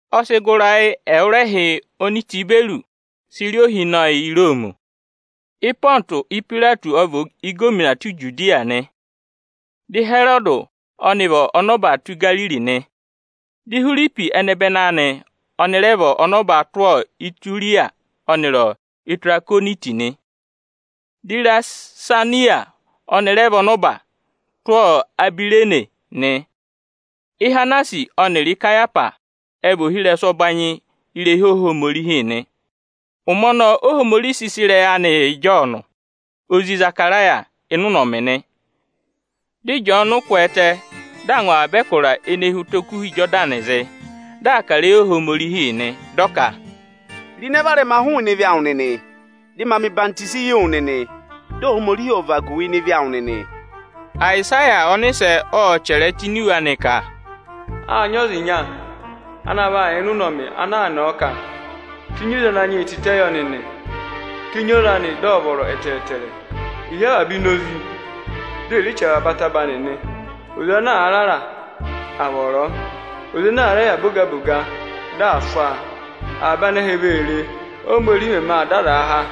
Ọ sị gụ ịrayị ẹwụrẹhị oni Itiberịyọsị sị rị ohinọyị Iroomi. Ịpọntụsị Ipayireti ọ vị ịgọvọnọ tụ́ Ijudiya nị. Dị Ịhẹrọdị ọnị vị ọnọba tụ́ Igariri nị, di Ihwiripi ẹnẹbẹnị anị ọnị rẹ vị ọnọba tụ́ Ituriya ọnịrị Itirakoniti nị. Dị Irisaniyasi ọnị rẹ vị ọnọba tụ́ Abirene nị. Ihanasi ọnịrị Ikayahwasi ẹ vị ohirẹsụ ẹbanyị irehi Ohomorihi nị. Ụmẹ ọnọọ Ohomorihi sị sị ịrẹyị anị yị Ịjọọnụ, ozi Ịzakaraya ịnị ụnọmị nị. Dị Ịjọọnụ kwẹẹtẹ, dị aa ngụ avaba ẹkụra ene hi ụtọ Okuha Ịjọdanịị zị, dị aa kà ịrẹyị Ohomorihi nị. Dị ọ ka, “Ro ịnẹ varẹma hụụnị ebira ọhịmị awụ nịnị, dị a mẹ̀ ọyịhwọzenyi yị wụ nịnị, dị Ohomorihi ọ̀ vagu wu ịnị ịvị awụ nịnị!” Ayịsaya ọnịsẹ ộ chẹrẹ ẹ tụ́ ini iwe anị ka, “Â nyị ọza ịnya ana vaa yà ịnị ụnọmị ana aa nọ ọ ka, ‘Tenyi oze Ananyị yị tịtẹ yọ nịnị! Tenyi oze anị, dị ọ̀ vọrọ ẹtẹẹtẹrẹ. È hí avaba inozi; di è re chì avaba ataba nịnị. Oze ana àa rara, à vọrọ ọ; oze ana àa rẹ yà boga-boga, dị à swaa! Avaba anẹhẹ vee re, Óhomorihi mẹmẹ aa dọ azaa há.’”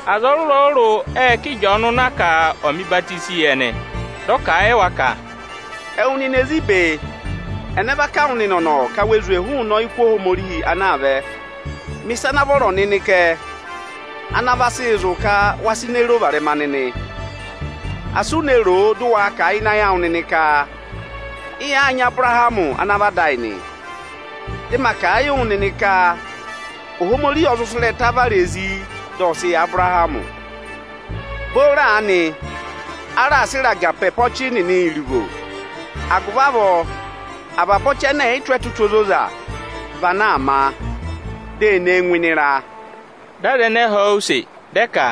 Aza ọrụrụ-ọrụrụ ệ ká Ịjọọnụ na ka ọ̀ mẹ̀ ọyịhwọzenyi yị ẹnị. Dị ọ kà a yị wa ka, “Ẹwụ nịnị ezi ibe, ẹnẹ va kà wụ nịnị ọ̀nọ̀ ka we zwe yị ọyịkụ Ohomorihi ana aa vẹ? Mẹ ịsa ana vọrọ nịnị kẹ, ana vaa sị zụ̀ ka we reè ro ịnẹ varẹma nịnị! Asị u ne ro o, dị ụ waa kà a ịnị ayị awụ nịnị ka: ‘Ị yàaa nyị Abụrahamị ana vị ada ayị nị,’ Dị ma kà a yị wụ nịnị ka Ohomorihi ọ zụ sị ịrẹta vara ezi, dị ọ sị yị Abụrahamị. Booro aanị, a raà sị ịraga pe ọchị nịnị iruvo, agụvị avọọ avaba ọchị ẹnẹ ẹ̀ yị tụ́ ẹtụtụ ozoza, vị ana a vaa má, di ee ne e ngụ ịnị ịra.” Dị aza ẹnẹẹ họ̀ ọ use, dị ẹ ka,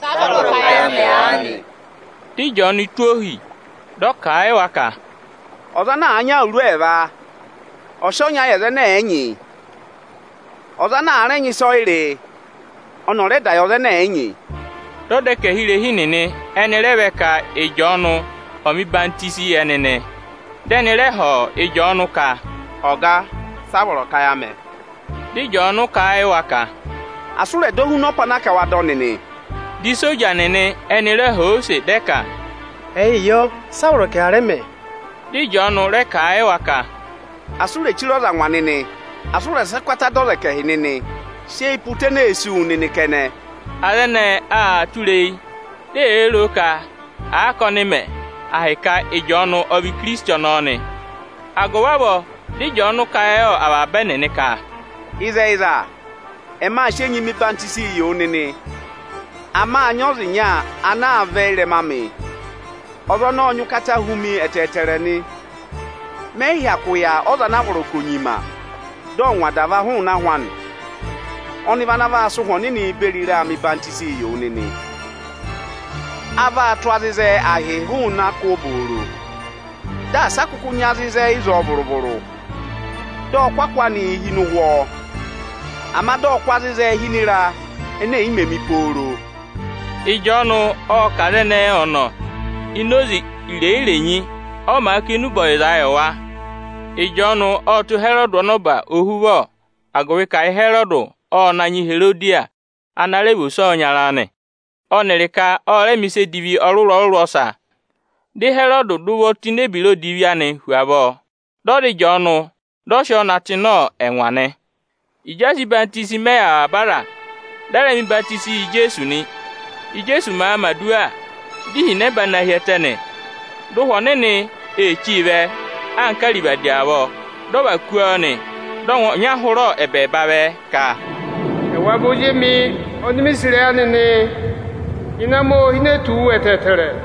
“Sị a vọrọ ka ya mẹ aanị?” Dị Ịjọọnụ tụ́ ohi, dị ọ kà a yị wa ka, “Ọza ana àa nyị awuru ẹẹva, ọ̀ sị ọnya yị ọza ẹnẹ ẹ̀ yị nyị! Ọza ana àa rẹ nyị ịsọyịrị, ọnị ọ̀ rẹ dà yị ọza ẹnẹ ẹ̀ yị nyị!” Dị ọdẹkẹhirehi nịnị ẹnị rẹ vẹ ka Ịjọọnụ ọ̀ mẹ̀ ọyịhwọzenyi yị ẹnị nị. Dị ẹnị rẹ họ̀ Ịjọọnụ kà: “Ọga, sị a vọrọ ka ẹ yà mẹ?” Dị Ịjọọnụ kà a yị wa ka, “Asị ụ rẹ̀ dọ huna ọpa ana a ka waa dọ nịnị!” Di isoja nịnị ẹnị rẹ họ̀ ọ use, dị ẹ ka, “Ẹyịị yọ, si a vọrọ ka ẹ yà rẹ mẹ?” Dị Ịjọọnụ rẹ kà a yị wa ka, “Asị u rè chire ọza angwa nịnị! Asị ụ rẹ̀ sị ụkata dọ ọza ẹkẹhị nịnị, sị eyi pe ụta ene ee sí wu nịnị kẹnẹ!” Aza ẹnẹẹ aa tụra eyi, di eyee ro o ka àa ka ọnịị mẹ ahịka Ịjọọnụ ọ vị Ikirisiti ọnọọ nị. Agụvị avọọ dị Ịjọọnụ kà a yị avaba ẹnịnị ka, “Ịzẹyịza, ẹmị aa sị enyi mẹ̀ ọyịhwọzenyi yị wụ nịnị, ama â nyị ọza ịnya ana vaa vẹ ị́rẹma amị, ọza ọnọọ ọ nyị ụkata hu mi ẹtẹẹtẹrẹ nị. Mẹ yị hyakụ yà ọza ana a vọrọ ka ò nyima, dị ọ̀ ngwa adava hụụnị ahụ anị. Ọnị vị ana vaa sị Ụhwẹ Ọnịnị beri ịra hụ́ nịnị enyi Aa vaa tụ́ azịzẹ ahịị hụụ nị akụ obooro, di asị a kụkụ nyị azịzẹ ịzọọ vụrụ-vụrụ. Dị ọ kụ́ akụ anị hi ịnị ụhwọ, ama dị ọ kụ́ azịzẹ hi ịnị ịra ene è yi mē mi pooro.” Ịjọọnụ ộ kà aza ẹnẹẹ ọnọ ini oze irenyi-renyi, ọ màa kà enube ọyịzaa yị wa. Ịjọọnụ ộ tụ́ Ịhẹrọdị ọnọba ohuvọ, agụvị ka Ịhẹrọdị ọ na nyị Iherodiya ana rẹ vị ose ọyịnyara anị, ọnịrị ka ọ rẹ mẹ̀ ịsa edivi ọrụrụ ọsa. Dị Ịhẹrọdị dà ụvọ tụ́ ini ebira odivi anị hu avọọ, dị ọ za Ịjọọnụ, dị ọ sị ọọ na tụ́ ịnị ẹngwa nị. Ịjị a sị ọyịhwenyi mẹ yị avaba aza, dị a rẹ mẹ̀ ọyịhwọzenyi yị Ijeesu nị. Íjeesu màa mẹ̀ aduwa, di ihinẹba na hi ẹtẹ nị. Dị Ụhwẹ Ọnịnị chí vẹ anka arivadi avọọ, dị ọ và kú ọọ nị. Dị ọngwẹ ọnya hụrẹ ẹbẹẹba vẹ ka, “Ẹwa vị Ozi emi oni mi sì ịrẹyị anị nị, ịnẹ amị ô hine tù wu ẹtẹẹtẹrẹ.”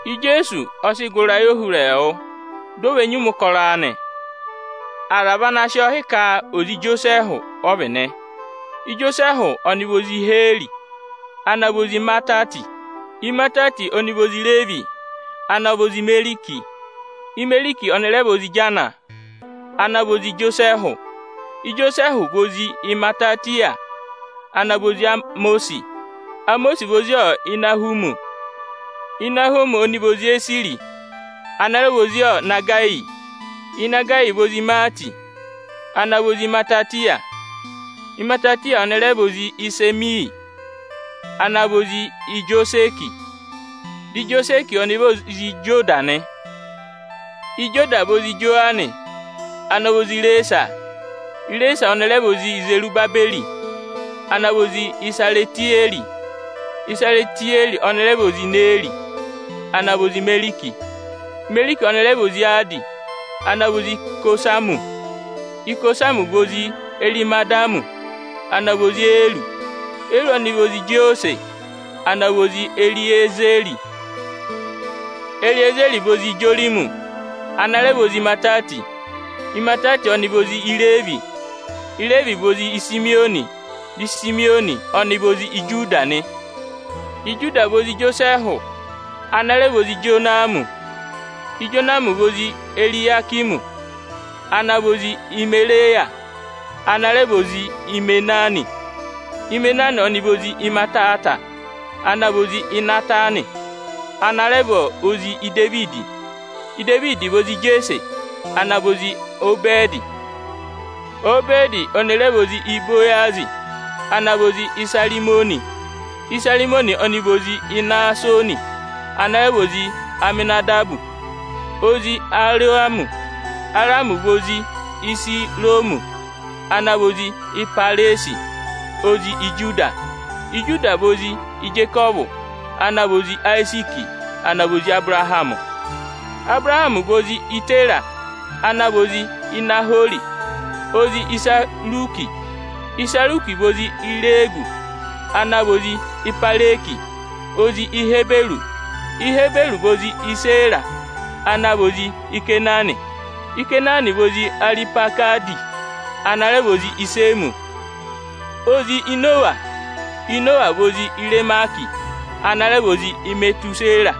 Ijeesu ọ sị gụ ịrayị ohurẹẹwụ, di o ve nyima ụkọrọ anị. Aza vị ana sị ọọ hị́ ka ozi Ijosẹẹhụ ọ vị nị. Ijosẹẹhụ ọnị vị ozi Iheri, ana vị ozi Imatati. Imatati ọnị vị ozi Ireevi, ana vị ozi Imeriki. Imeriki ọnị rẹ vị ozi Ijana, ana vị ozi Ijosẹẹhụ. Ijosẹẹhụ vị ozi Imatatiya, ana vị ozi Emọsị. Emọsị vị ozi Ịnahụmị. Ịnahụmị ọnị vị ozi Esiri, ana rẹ vị ozi Inagayi. Inagayi vị ozi Imaati, ana vị ozi Imatatiya. Imatatiya ọnị rẹ vị ozi Isemeyi ana vị ozi Ijosẹkị. Dị Ijosẹkị ọnị vị ozi Ijoda nị. Ijoda vị ozi Ijowananị, ana vị ozi Ireesa. Ireesa ọnị rẹ vị ozi Izerubabẹrị, ana vị ozi Isaritiyẹrị. Isaritiyẹrị ọnị vị ozi Ineeri, ana vị ozi Imeriki. Imeriki ọnị rẹ vị ozi Adi, ana vị ozi Ikosamị. Ikosamị vị ozi Erimadami, ana vị ozi Eri. Eri ọnị rẹ vị ozi Ijosẹsị ana vị ozi Eriiza. Eriiza vị ozi Ijorimi, ana rẹ vị ozi Imatati. Imatati ọnị vị ozi Ireevi. Ireevi vị ozi Isimiyọnị, dị Isimiyọnị ọnị vị ozi Ijuda nị. Ijuda vị ozi Ijosẹẹhụ, ana rẹ vị ozi Ijonami. Ijonami vị ozi Eriyakimi, ana vị ozi Imereya, ana rẹ vị ozi Imena. Imena ọnị vị ozi Imatata, ana vị ozi Ịnatanị, ana rẹ vị ozi Idevidi. Idevidi vị ozi Ijeese ana vị ozi Obẹdị. Obẹdị ọnị rẹ vị ozi Ibowazị, ana vị ozi Ịsarịmọnị. Ịsarịmọnị ọnị vị ozi Inasoni, ana rẹ vị ozi Aminadabi, ozi Aramị. Aramị vị ozi Ihezironi, ana vị ozi Ịpẹrẹzị, ozi Ijuda. Ijuda vị ozi Ijekọvụ, ana vị ozi Ayiziiki, ana vị ozi Abụrahamị. Abụrahamị vị ozi Ịtẹra, ana vị ozi Inahori, ozi Iserugu. Iserugu vị ozi Irewu, ana vị ozi Ịpẹrẹgị ozi Eberi. Eberi vị ozi Ịsẹra, ana vị ozi Ikeenani. Ikeenani vị ozi Arihwakadi, ana rẹ vị ozi Ịsẹmị, ozi Inowa. Inowa vị ozi Irameki, ana rẹ vị ozi Imetusẹra,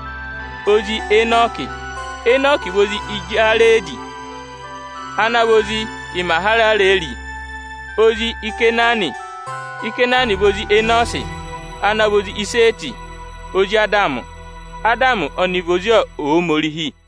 ozi Enọkị. Enọkị vị ozi Ịjarẹdị, ana vị ozi Imahararẹrị, ozi Ikeenani. Ikenani vị ozi Enosi, ana vị ozi Ịsẹẹtị, ozi Adamị. Adamị ọnị vị ozi Ohomorihi.